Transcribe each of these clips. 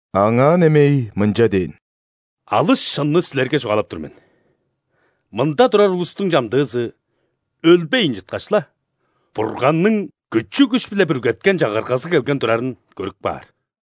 Аңаа немей мынча дээн: «Алыс шынны силерге чугаалап тур мен: мында турар улустуң чамдыызы, өлбейн чыткаш-ла, Бурганның күчү-күш-биле бүргеткен Чагыргазы келген турарын көрүп каар».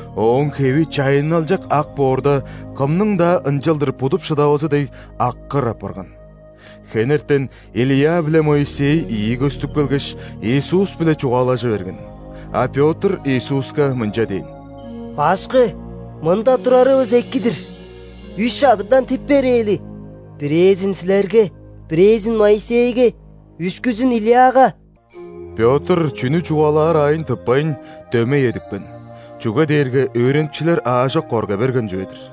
Ооң хеви чайынналчак ак боорда, кымның-даа ынчалдыр будуп шыдавазы дег, аккыр апарган. Хенертен Илия биле Моисей ийи көстүп келгеш, Иисус-биле чугаалажы берген. А Пётр Иисуска мынча дээн: «Башкы, мында турарывыс эки-дир! Үш чадырдан тип берээли: бирээзин – Силерге, бирээзин – Моисейге, үшкүзүн – Илияга». Пётр чүнү чугаалаар аайын тыппайн, дөмей эдипкен, чүге дээрге өөреникчилер аажок корга берген чүве-дир.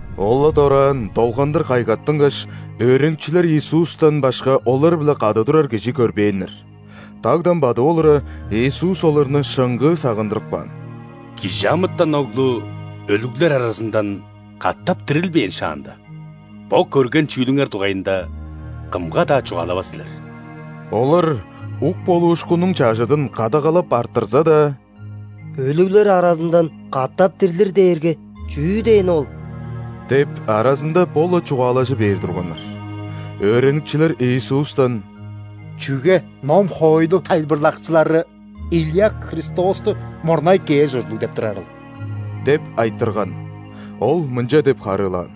Ол-ла дораан долгандыр кайгаттынгаш, өөреникчилер Иисустан башка олар-биле кады турар кижи көрбээннер. Дагдан бадып олура, Иисус оларны шыңгыы сагындырып каан: «·Кижи амытан Оглу өлүглер аразындан катап дирилбээн шаанда, бо көрген чүүлүңер дугайында кымга-даа чугаалавас силер». Олар ук болуушкуннуң чажыдын кадагалап арттырза-даа: «„Өлүглер аразындан катап дирлир“ дээрге чүү дээни ол?» – деп, аразында бо-ла чугаалажы бээр турганнар. Өөреникчилер Иисустан: «Чүге ном-хоойлу тайылбырлакчылары Илия Христосту мурнай кээр ужурлуг деп турарыл?» – деп айтырган. Ол мынча деп харыылаан: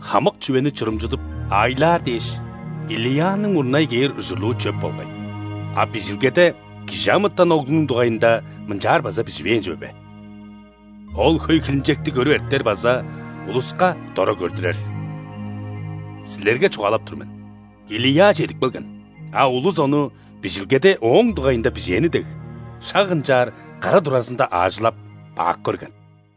«Хамык чүвени чурумчудуп, аайлаар дээш, Илияның мурнай кээр ужурлуу чөп болгай. А Бижилгеде ·Кижи амытан Оглунуң дугайында мынчаар база биживээн чүве бе: „Ол хөй хилинчекти көрүп эртер база улуска дора көрдүрер“. Силерге чугаалап тур мен: Илия чедип келген, а улус ону, Бижилгеде ооң дугайында бижээни дег, шак ынчаар кара туразында аажылап, бак көрген».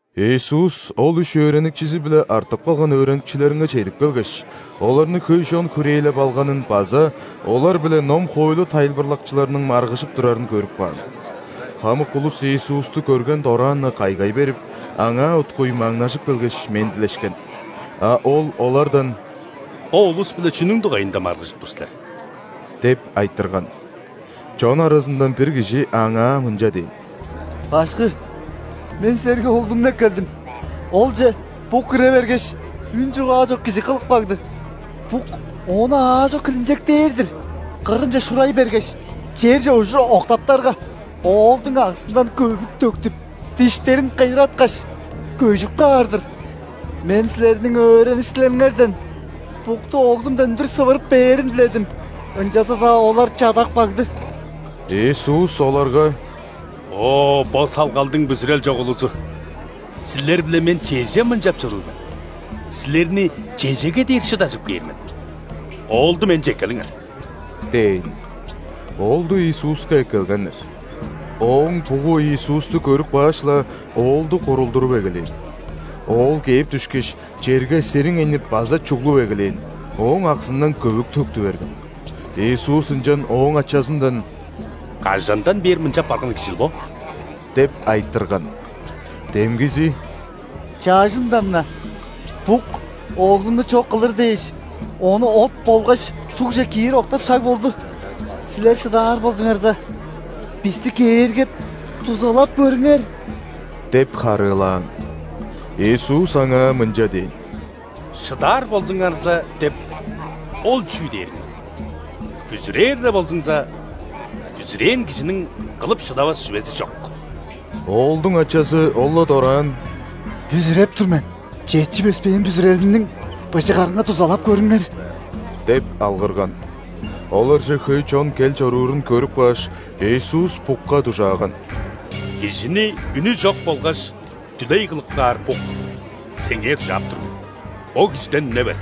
Иисус ол үш өөреникчизи-биле артып калган өөреникчилеринге чедип келгеш, оларны хөй чон хүрээлеп алганын база олар-биле ном-хоойлу тайылбырлакчыларының маргыжып турарын көрүп каан. Хамык улус Иисусту көрген дораан-на кайгай берип, Аңаа уткуй маңнажып келгеш, мендилешкен. А Ол олардан: «Бо улус-биле чүнүң дугайында маргыжып тур силер?» – деп айтырган. Чон аразындан бир кижи Аңаа мынча дээн: «Башкы! Мен Силерге оглумну эккелдим. Олче бук кире бергеш, үн-чугаа чок кижи кылып кагды. Бук ону аажок хилинчектээр-дир: кырынче шурай бергеш, черже ужур октаптарга, оолдуң аксындан көвүк төктүп, диштерин кыйыраткаш, көжүп каар-дыр. Мен Силерниң өөреникчилериңерден букту оглумдан үндүр сывырып бээрин диледим, ынчалза-даа олар чадап кагды». Иисус оларга: «О, бо салгалдың бүзүрел чок улузу! Силер-биле Мен чеже мынчап чоруур мен? Силерни чежеге дээр шыдажып кээр мен? Оолду Менче эккелиңер» – дээн. Оолду Иисуска эккелгеннер. Ооң бугу Иисусту көрүп кааш-ла, оолду курулдуруп эгелээн. Оол кээп дүшкеш, черге сириңейнип база чуглуп эгелээн, ооң аксындан көвүк төктү берген. Иисус ынчан ооң ачазындан: «Кажандан бээр мынчап барган кижил бо?» – деп айтырган. Демгизи: «Чажындан-на. Бук оглумну чок кылыр дээш, ону от болгаш сугже киир октап шаг болду. Силер шыдаар болзуңарза, бисти кээргеп, дузалап көрүңер!» – деп харыылаан. Иисус аңаа мынча дээн: «„Шыдаар болзуңарза“ – деп ол чүү дээриң ол? Бүзүрээр-ле болзуңза, бүзүрээн кижиниң кылып шыдавас чүвези чок». Оолдуң ачазы ол-ла дораан: «Бүзүреп тур мен! Четчип өспээн бүзүрелимниң быжыгарынга дузалап көрүңер!» – деп алгырган. Оларже хөй чон кел чоруурун көрүп кааш, Иисус букка дужааган: «Кижини үнү чок болгаш дүлей кылып каар бук, сеңээ дужаап тур мен: бо кижиден үне бер,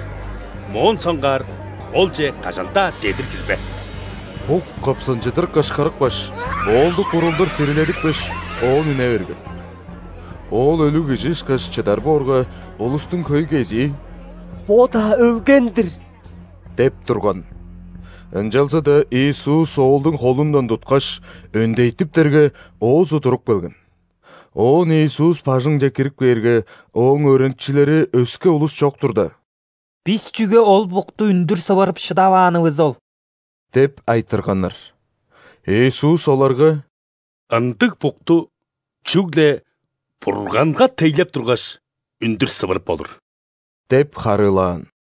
моон соңгаар олче кажан-даа дедир кирбе!» Бук кыпсынчыдыр кышкырыпкаш, оолду курулдур сириледипкеш, оон үне берген. Оол өлүг кижи ышкаш чыдар боорга, улустуң хөй кезии: «Бо-даа өлген-дир» – деп турган. Ынчалза-даа Иисус оолдуң холундан туткаш, өндейтиптерге, оозу туруп келген. Оон Иисус бажыңче кирип кээрге, Ооң өөреникчилери өске улус чок турда: «Бис чүге ол букту үндүр сывырып шыдаваанывыс ол?» – деп айтырганнар. Иисус оларга: «Ындыг букту чүгле Бурганга тейлеп тургаш, үндүр сывырып болур» – деп харыылаан.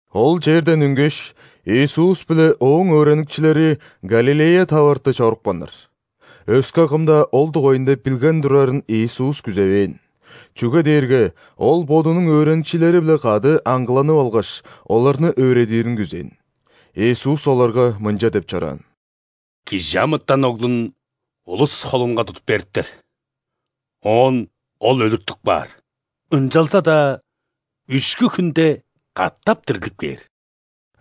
Ол черден үнгеш, Иисус биле Ооң өөреникчилери Галилея таварты чорупканнар. Өске кым-даа ол дугайында билген турарын Иисус күзевээн. Чүге дээрге Ол Бодунуң өөреникчилери-биле кады аңгыланып алгаш, оларны өөредирин күзээн. Иисус оларга мынча деп чораан: «·Кижи амытан Оглун улус холунга тудуп бериптер, оон Ол өлүртүп каар, ынчалза-даа үшкү хүнде катап дирлип кээр».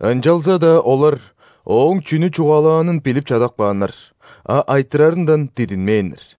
Ынчалза-даа олар Ооң чүнү чугаалаанын билип чадап кааннар, а айтырарындан дидинмээннер.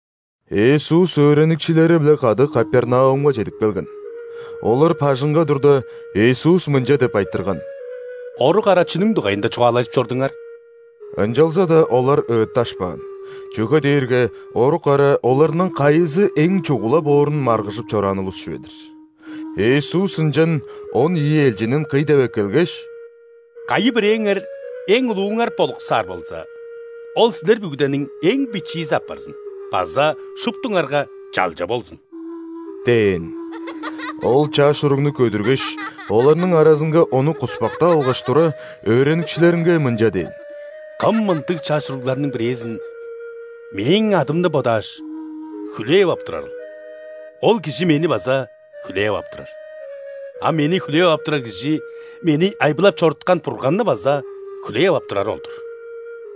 Иисус өөреникчилери-биле кады Капернаумга чедип келген. Олар бажыңга турда, Иисус мынча деп айтырган: «Орук ара чүнүң дугайында чугаалажып чордуңар?» Ынчалза-даа олар ыытташпаан, чүге дээрге орук ара оларның кайызы эң чугула боорун маргыжып чораан улус чүве-дир. Иисус ынчан он ийи элчинин кый деп эккелгеш: «Кайы-бирээңер эң улууңар болуксаар болза, ол силер бүгүдениң эң бичиизи апарзын база шуптуңарга чалча болзун» – дээн. Ол чаш уругну көдүргеш, оларның аразынга ону куспактап алгаш тура, өөреникчилеринге мынча дээн: «Кым мындыг чаш уругларның бирээзин Мээң адымны бодааш, хүлээп ап турарыл, ол кижи Мени база хүлээп ап турар. А Мени хүлээп ап турар кижи Мени айбылап чоруткан Бурганны база хүлээп ап турары ол-дур».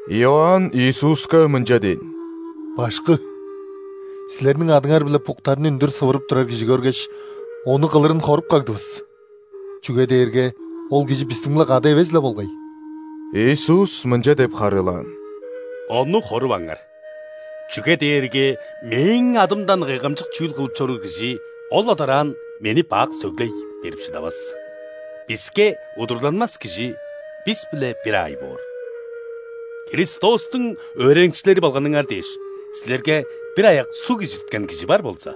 Иоанн Иисуска мынча дээн: «Башкы! Силерниң адыңар-биле буктарны үндүр сывырып турар кижи көргеш, ону кылырын хоруп кагдывыс, чүге дээрге ол кижи бистиң-биле кады эвес-ле болгай». Иисус мынча деп харыылаан: «Ону хоруваңар, чүге дээрге Мээң адымдан кайгамчык чүүл кылып чоруур кижи ол-ла дораан Мени бак сөглей берип шыдавас. Биске удурланмас кижи бис-биле бир аай боор. Христостуң өөреникчилери болганыңар дээш, силерге бир аяк суг ижирткен кижи бар болза,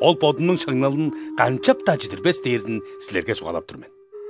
ол бодунуң шаңналын канчап-даа чидирбес дээрзин силерге чугаалап тур мен.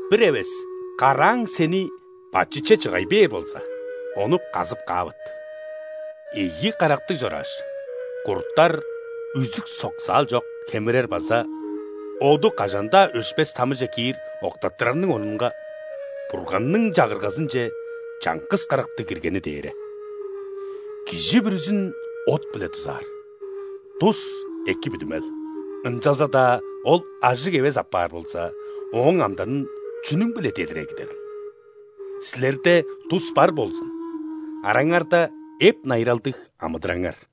Бир эвес карааң сени бачытче чыгай бээр болза, ону казып каавыт. Ийи карактыг чорааш, курттар үзүк-соксаал чок хемирер база оду кажан-даа өшпес тамыже киир октаттырарының орнунга, Бурганның Чагыргазынче чаңгыс карактыг киргени дээре. Кижи бүрүзүн от-биле дузаар. Дус – эки бүдүмел, ынчалза-даа ол ажыг эвес апаар болза, ооң амданын чүнүң-биле дедир эгидерил? Силерде дус бар болзун, араңарда эп-найыралдыг амыдыраңар».